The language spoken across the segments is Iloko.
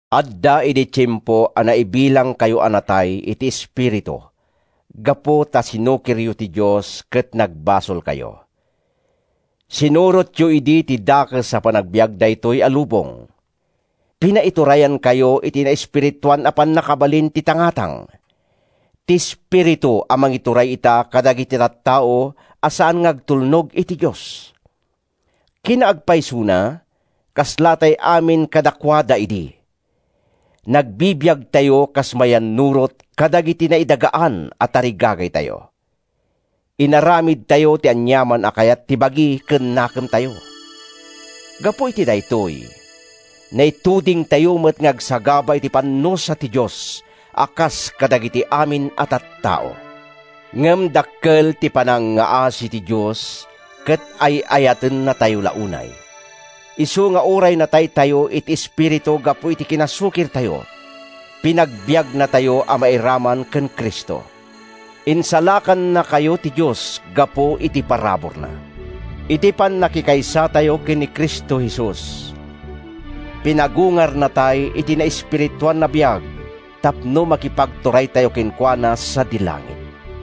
Adda idi tiempo a naibilangkayo a natay iti espiritu gapu ta sinukiryo ti Dios ket nagbasolkayo. Sinurotyo idi ti dakes a panagbiag daytoy a lubong. Pinaiturayankayo iti naespirituan a pannakabalin ti tangatang, ti espiritu a mangituray ita kadagiti tattao a saan nga agtulnog iti Dios. Kinaagpaysona, kaslatay amin kadakuada idi. Nagbibiagtayo kas mayannurot kadagiti naidagaan a tarigagaytayo. Inaramidtayo ti aniaman a kayat ti bagi ken nakemtayo. Gapu iti daytoy, naitudingtayo met nga agsagaba iti pannusa ti Dios a kas kadagiti amin a tattao. Ngem dakkel ti panangngaasi ti Dios ket ay-ayatennatayo la unay, isu nga uray nataytayo iti espiritu gapu iti kinasukirtayo, pinagbiagnatayo a mairaman ken Cristo. Insalakannakayo ti Dios gapu iti paraburna. Iti pannakikaysatayo ken Cristo Jesus, pinagungarnatay iti naespirituan a biag tapno makipagturaytayo kenkuana sadi langit.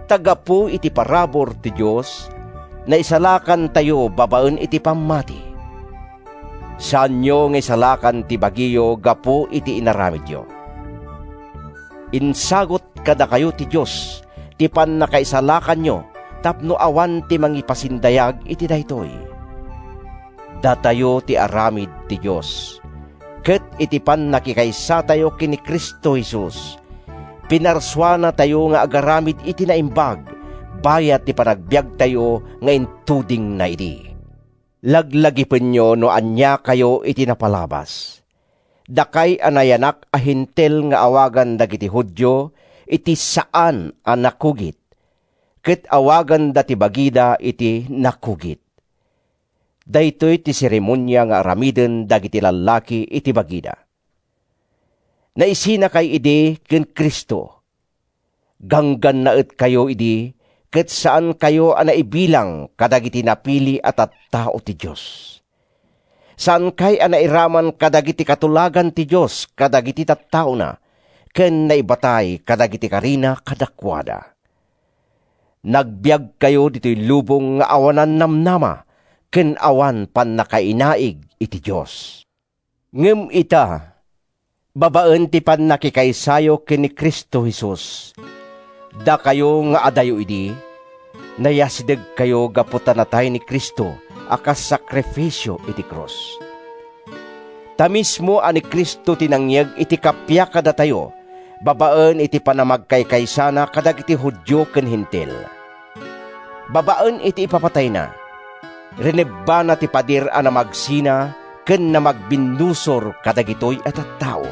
Ta gapu iti parabur ti Dios, naisalakantayo babaen iti pammati. Saanyo nga insalakan ti bagiyo gapu iti inaramidyo. Insagut kadakayo ti Dios ti pannakaisalakanyo tapno awan ti mangipasindayag iti daytoy. Datayo ti aramid ti Dios, ket iti pannakikaysatayo ken ni Cristo Jesus, pinarsuanatayo nga agaramid iti naimbag bayat ti panagbiagtayo nga intudingna idi. Laglagipenyo no aniakayo iti napalabas, dakay a nayanak a Hentil nga awagan dagiti Judio iti “saan a nakugit,” ket awaganda ti bagida iti “nakugit,” (daytoy ti seremonia nga aramiden dagiti lallaki iti bagida). Naisinakay idi ken Cristo. Ganggannaetkayo idi ket saankayo a naibilang kadagiti napili a tattao ti Dios. Saankay a nairaman kadagiti katulagan ti Dios kadagiti tattaona ken naibatay kadagiti karina kadakuada. Nagbiagkayo ditoy lubong nga awanan namnama ken awanan pannakainaig iti Dios. Ngem ita, babaen ti pannakikaysayo ken ni Cristo Jesus, dakayo nga adayo idi, nayasidegkayo gapu ta natay ni Cristo a kas sakrifisio iti krus. Ta mismo a ni Cristo ti nangyeg iti kappia kadatayo babaen ti panamagkaykaysana kadagiti Judio ken Hentil. Babaen iti ipapatayna, rinebbana ti pader a namagsina ken namagbinnusor kadagitoy a tattao.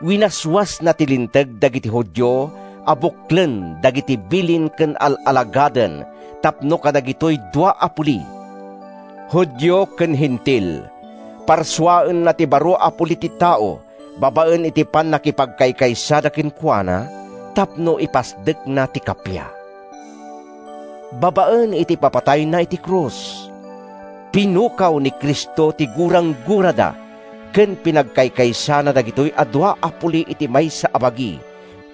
Winaswasna ti Linteg dagiti Judio a buklen dagiti bilin ken al-alagaden tapno kadagitoy dua a puli—Judio ken Hentil—parsuaenna ti baro a puli ti tao babaen iti pannakipagkaysada kenkuana, tapno ipasdekna ti kappia. Babaen iti ipapatayna iti krus, pinukaw ni Cristo ti guranggurada ken pinagkaykaysana dagitoy dua a puli iti maysa a bagi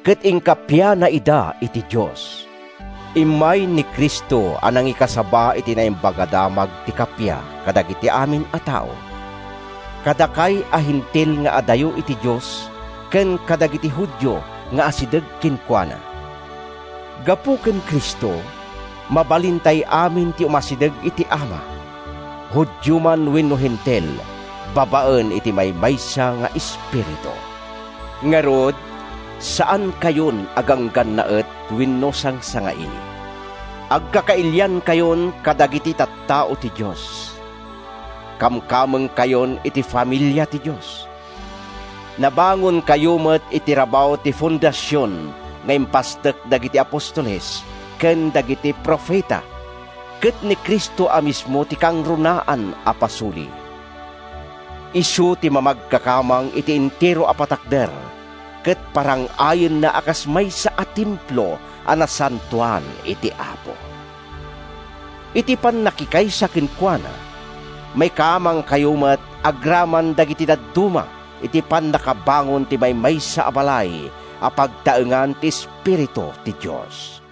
ket inkappiana ida iti Dios. Immay ni Cristo a nangikasaba iti Naimbag a Damag ti kappia kadagiti amin a tao—kadakay a Hentil nga adayo iti Dios ken kadagiti Judio nga asideg kenkuana. Gapu ken Cristo, mabalintay amin ti umasideg iti Ama, Judio man wenno Hentil, babaen iti maymaysa nga Espiritu. Ngarud, saankayon a ganggannaet wenno sangsangaili. Agkakailiankayon kadagiti tattao ti Dios. Kamkamengkayon iti familia ti Dios. Nabangonkayo met iti rabaw ti fondasion nga impasdek dagiti apostoles ken dagiti profeta, ket ni Cristo a mismo ti kangrunaan a pasuli. Isu ti mamagkakamang iti entero a patakder ket parang-ayenna a kas maysa a templo a nasantoan iti Apo. Iti pannakikaysa kenkuana, maikamangkayo met agraman dagiti dadduma iti pannakabangon ti maymaysa a balay a pagtaengan ti Espiritu ti Dios.